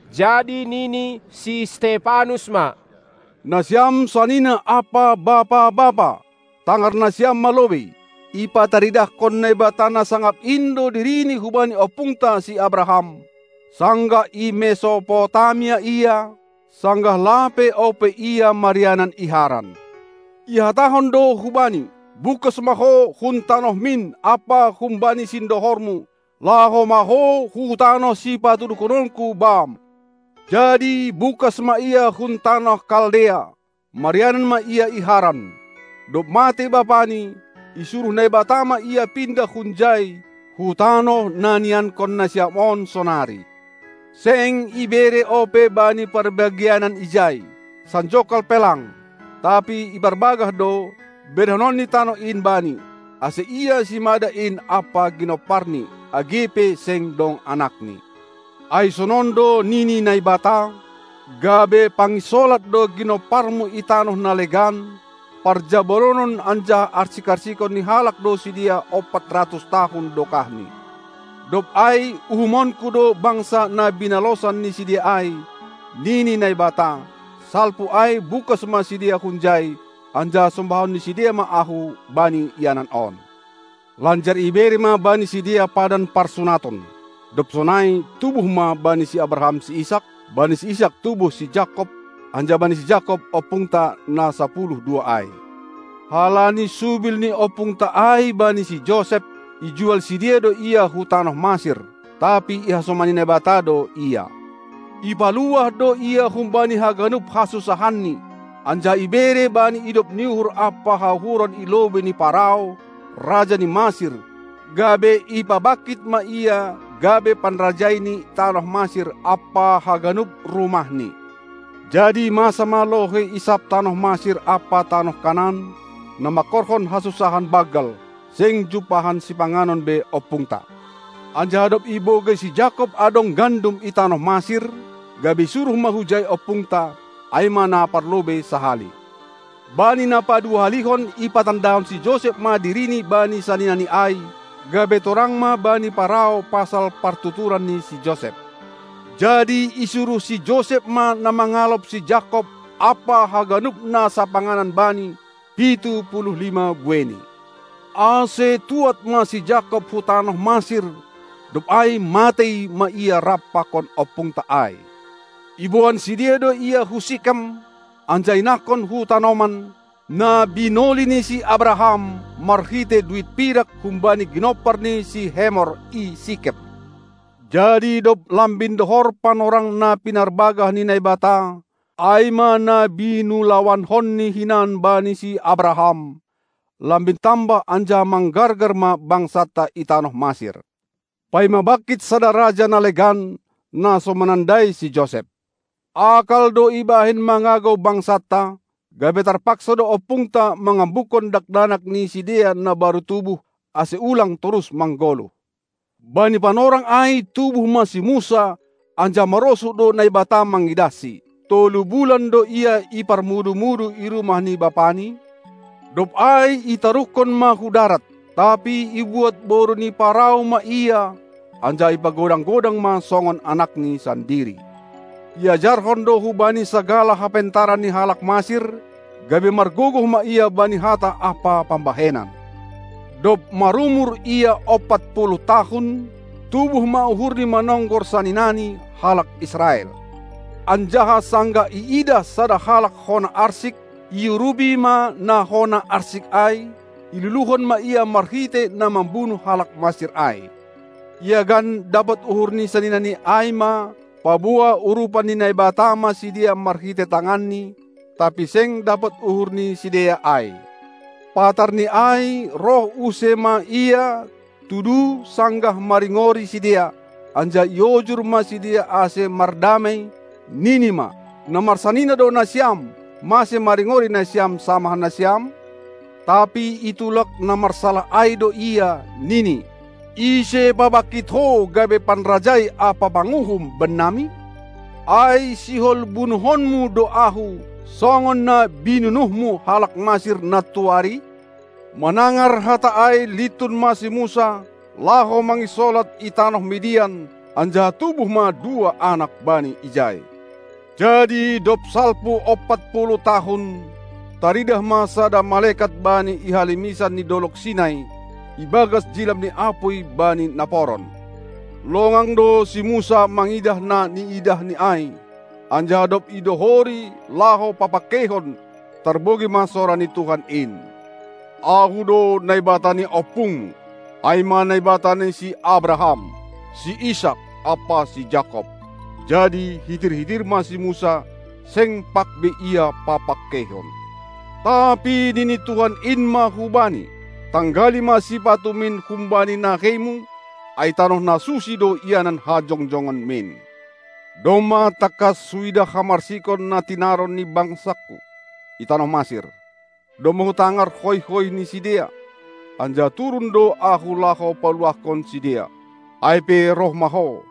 Jadi nini si Stepanus ma: Nasiam sanina ampa bapa-bapa, tangar nasiam ma lobei! Ipataridahkon Naibata na sangap in do Dirini hubani ompungta si Abraham, sanggah i Mesopotamia ia, sanggah lape ope ia marianan i Haran. Ihatahon do hubani: Bungkas ma ho hun tanohmin ampa humbani sindohormu, laho ma ho hu tanoh sipatuduhononKu bam! Jadi bungkas ma ia hun tanoh Kaldea, marianan ma ia i Haran. Dob matei bapani, isuruh Naibata ma ia pindah hunjai hu tanoh na niiankon nasiam on sonari. Seng ibere ope bani parbagianan ijai, sanjongkal pe lang, tapi iparbagah do, berehononni tanoh in bani, ase ia simada in ampa ginomparni, age pe seng dong anakni. Ai sonon do nini Naibata: Gabe panginsolat do ginomparmu i tanoh na legan; parjabolonon anjaha arsik-arsikon ni halak do sidea ompat ratus tahun dokahni. Dob ai uhumonKu do bangsa na binalosan ni sidea ai, nini Naibata; salpu ai bungkas ma sidea hunjai, anjaha sombahon ni sidea ma Ahu bani ianan on. Lanjar ibere ma bani sidea padan parsunaton. Dob sonai, tubuh ma bani si Abraham si Isak, bani si Isak tubuh si Jakob, anjaha bani si Jakob ompungta na sapuluh dua ai. Halani subil ni ompungta ai bani si Josep, ijual sidea do ia hu tanoh Masir. Tapi ihasomani Naibata do ia, ipaluah do ia humbani haganup hasunsahanni, anjaha ibere bani idop ni uhur ampa hauhuron i lobei ni Parao, raja ni Masir, gabe ipabangkit ma ia gabe panrajai ni tanoh Masir ampa haganup rumahni. Jadi masa ma lohei i sab tanoh Masir ampa tanoh Kanaan, na mangkorhon hasunsahan banggal, seng jumpahan sipanganon be ompungta. Anjaha dob ibogei si Jakob adong gandum i tanoh Masir, gabe isuruh ma hujai ompungta, ai ma na parlobei sahali. Bani na paduahalihon ipatandahon si Josep ma dirini bani saninani ai, gabe torang ma bani Parao pasal partuturan ni si Josep. Jadi isuruh si Josep ma na mangalop si Jakob ampa haganup na sapanganan bani, pitu puluh lima bueini. Ase tuad ma si Jakob hu tanoh Masir, dob ai matei ma ia rap pakon ompungta ai. Iboan sidea do ia hu Sikem, anjaha inahkon hu tanoman, na binoli ni si Abraham marhitei duit pirak humbani ginompar ni si Hemor i Sikem. Jadi dob lambin dohor panorang na pinarbagah ni Naibata, ai ma na binulawankonni hinan bani si Abraham, lambin tambah anjaha manggargar ma bangsanta i tanoh Masir, paima bangkit sada raja na legan, na so manandai si Josep. Akal do ibahen mangagou bangsanta, gabe tarpaksa do ompungta mangambukkon dakdanak ni sidea na baru tubuh, ase ulang torus manggoluh. Bani panorang ai tubuh ma si Musa, anjaha marosuh do Naibata mangidahsi. Tolu bulan do ia iparmudu-mudu i rumah ni bapani, dob ai itaruhkon ma hu darat, tapi ibuat boru ni Parao ma ia, anjaha ipagodang-godang ma songon anakni sandiri. Iajarhon do hubani sagala hapentaran ni halak Masir, gabe margogoh ma ia bani hata ampa pambahenan. Dob marumur ia ompat puluh tahun, tubuh ma uhurni manonggor saninani, halak Israel. Anjaha sanggah iidah sada halak hona arsik, iurupi ma na hona arsik ai, iluluhon ma ia marhitei na mambunuh halak Masir ai. Iagan, dapot uhur ni saninani ai ma, paboa urupan ni Naibata ma sidea marhitei tanganni, tapi seng dapot uhur ni sidea ai. Patar ni ai, roh use ma ia, tudu sanggah maringori sidea, anjaha iojur ma sidea ase mardamei, nini ma: Na marsanina do nasiam, mase maringori nasiam samah nasiam? Tapi itulak na marsalah ai do ia, nini: Ise pabangkit ho gabe panrajai ampa panguhum bannami? Ai sihol bunuhonmu do ahu, songon na binunuhmu halak Masir nantuari? Manangar hata ai lintun ma si Musa, laho manginsolat i tanoh Midian, anjaha tubuh ma dua anak bani ijai. Jadi dob salpu ompat puluh tahun, taridah ma sada malekat bani i halimisan ni dolog Sinai, ibagas jilam ni apuy bani naporon. Longang do si Musa mangidah na niidahni ai, anjaha dob idohori laho papangkeihon, tarbogei ma sora ni Tuhan in: Ahu do Naibata ni ompungmu, ai ma Naibata ni si Abraham, si Isak, ampa si Jakob. Jadi hitir-hitir ma si Musa, seng pag be ia papangkeihon. Tapi nini Tuhan in ma hubani: Tanggali ma sipatumin humbani naheimu, ai tanoh na susi do ianan hajongjonganmin. Domma tangkas huidah hamarsikon na tinaron ni bangsaKu i tanoh Masir, domma Hutangar hoih-hoih ni sidea; anjaha turun do Ahu laho paluahkon sidea. Ai pe roh ma ho,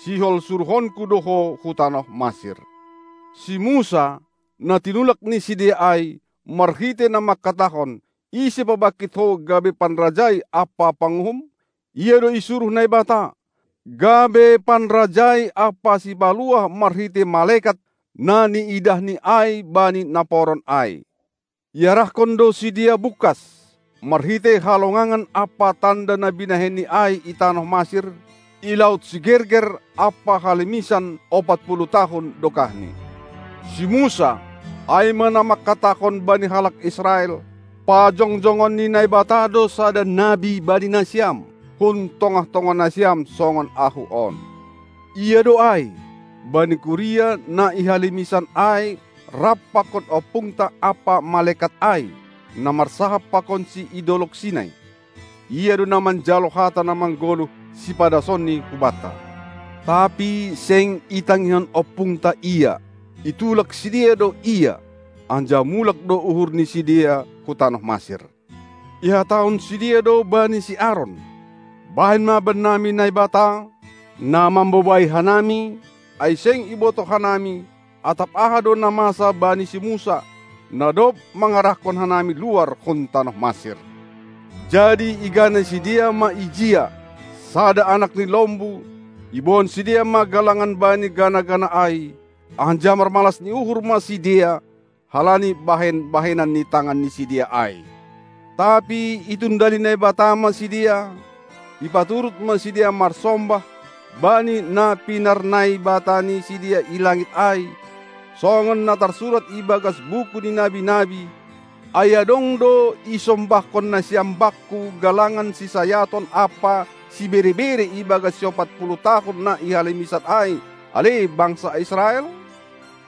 sihol suruhonKu do ho hu tanoh Masir. Si Musa, na tinulak ni sidea ai, marhitei na mangkatahon: "Ise pabangkit ho gabe panrajai ampa panguhum?" ia do isuruh Naibata, gabe panrajai ampa sipaluah marhitei malekat na niidahni ai bani naporon ai. Iarahkon do sidea bungkas, marhitei halongangan ampa tanda na binahenni ai i tanoh Masir, i laut Sigerger ampa halimisan ompat puluh tahun dokahni. Si Musa, ai ma na mangkatahon bani halak Israel: Pajongjongon ni Naibata do sada nabi bani nasiam, hun tongah-tongah nasiam songon ahu on. Ia do ai, bani kuria na i halimisan ai rap pakon ompungta ampa malekat ai, na marsahap pakonsi i dolog Sinai. Ia do na manjalo hata na manggoluh sipadasonni hubanta. Tapi seng itangihon ompungta ia, itulak sidea do ia, anjaha mulak do uhur ni sidea hu tanoh Masir. Ihatahon sidea do bani si Aron: Bahen ma bannami Naibata, na mambobai hanami, ai seng ibotoh hanami, atap aha do na masa bani si Musa, na dob mangarahkon hanami luar hun tanoh Masir. Jadi igana sidea ma ijia sada anak ni lombu, iboan sidea ma galangan bani gana-gana ai, anjaha marmalas ni uhur ma sidea halani bahen-bahenan ni tangan ni sidea ai. Tapi itundali Naibata ma sidea, ipaturut ma sidea marsombah bani na pinarnaibata ni sidea i langit ai, songon na tarsurat i bagas buku ni nabi-nabi: Ai adong do isombahkon nasiam Bakku galangan sisayaton ampa sibere-bere ibagas siompat puluh tahun na i halimisan ai, ale bangsa Israel?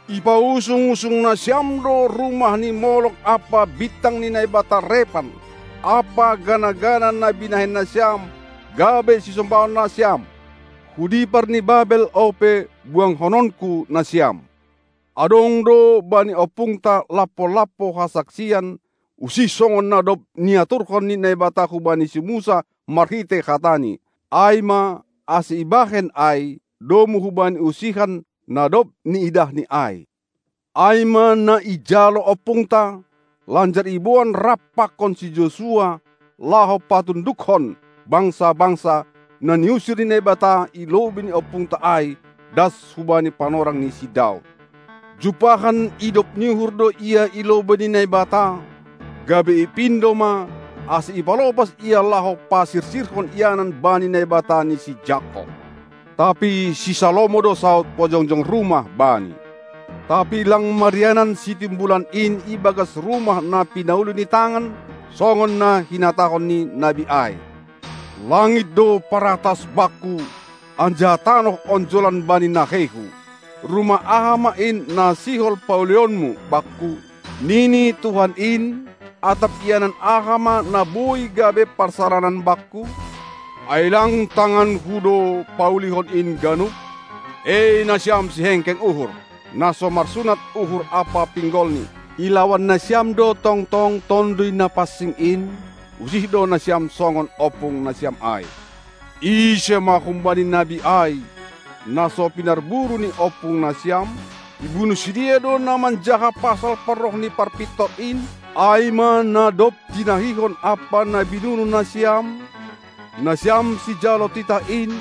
Ipausung-usung nasiam do rumah ni Molok ampa bintang ni naibata Rephan ampa gana-gana na binahen nasiam gabe sisombahon nasiam. Hu dipar ni Babel ope buangkononKu nasiam. Adong do bani ompungta lampo-lampo hasaksian, usih songon na dob niaturhon ni Naibata hubani si Musa marhitei hataNi, ai ma, ase ibahen ai domu hubani usihan, na dob niidahni ai. Ai ma na ijalo ompungta, lanjar iboan rap pakon si Josua laho patundukkon bangsa-bangsa, na niusir ni Naibata i lobei ni ompungta ai, das hubani panorang ni si Daud. Jumpahan idop ni uhur do ia i lobei ni Naibata, gabe ipindo ma, ase ipalopas ia laho pasirsirhon ianan bani Naibata ni si Jakob. Tapi si Salomo do saud pajongjong rumah Bani. Tapi lang marianan Sitimbulan in i bagas rumah na pinauli ni tangan, songon na hinatahon ni nabi ai: Langit do paratas Bakku, anjaha tanoh onjolan bani naheiHu. Rumah aha ma in, na sihol paulionmu Bakku, nini Tuhan in, atap ianan aha ma na boi gabe parsaranan Bakku? Ai lang tanganKu do paulihon in ganup? E nasiam sihengkeng uhur, na so marsunat uhur ampa pinggolni, ilawan nasiam do tongtong Tonduy Napansing in; usih do nasiam songon ompung nasiam ai. Ise ma humbani nabi ai, na so pinarburu ni ompungnasiam? Ibunuh sidea do na manjaha pasal parroh ni Parpintor in, ai ma na dob tinahihon ampa na binunuh nasiam, nasiam sijalo titah in,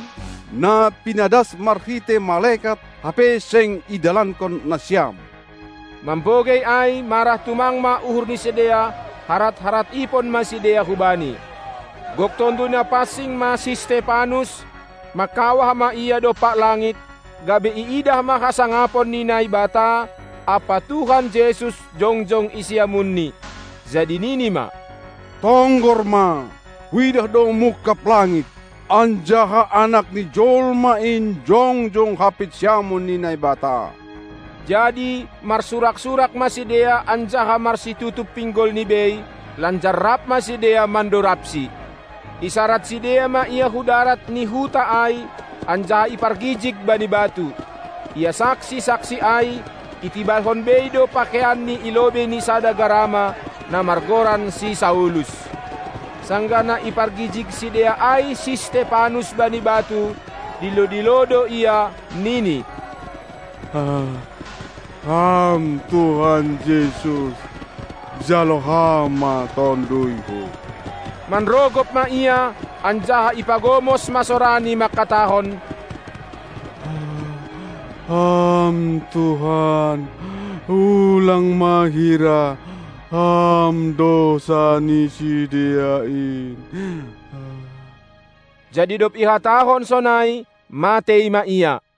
na pinadas marhitei malekat, hape seng idalankon nasiam. Mambogei ai marah tumang ma uhur ni sidea, harat-harat ipon ma sidea hubani. Gok Tonduy Napansing ma si Stepanus; mangkawah ma ia dompak langit, gabe iidah ma hasangapon ni Naibata ampa Tuhan Jesus jongjong i siamunNi. Jadi nini ma: Tonggor ma, huidah do mungkab langit, anjaha Anak ni jolma in jongjong hampit siamun ni Naibata! Jadi marsurak-surak ma sidea anjaha marsitutup pinggolni bei; lanjar rap ma sidea mandorabsi. Isarad sidea ma ia hu darat ni huta ai, anjaha ipargijig bani batu. Ia saksi-saksi ai, itibalhon bei do pakeianni i lobei ni sada garama, na margoran si Saulus. Sanggah na ipargijig sidea ai si Stepanus bani batu, dilo-dilo do ia, nini: Ham Tuhan Jesus, jalo Ham ma tonduyhu! Manrogop ma ia anjaha ipagomos ma sorani mangkatahon: Ham Tuhan, ulang ma hira Ham dousa ni sidea in! Jadi dob ihatahon sonai, matei ma ia.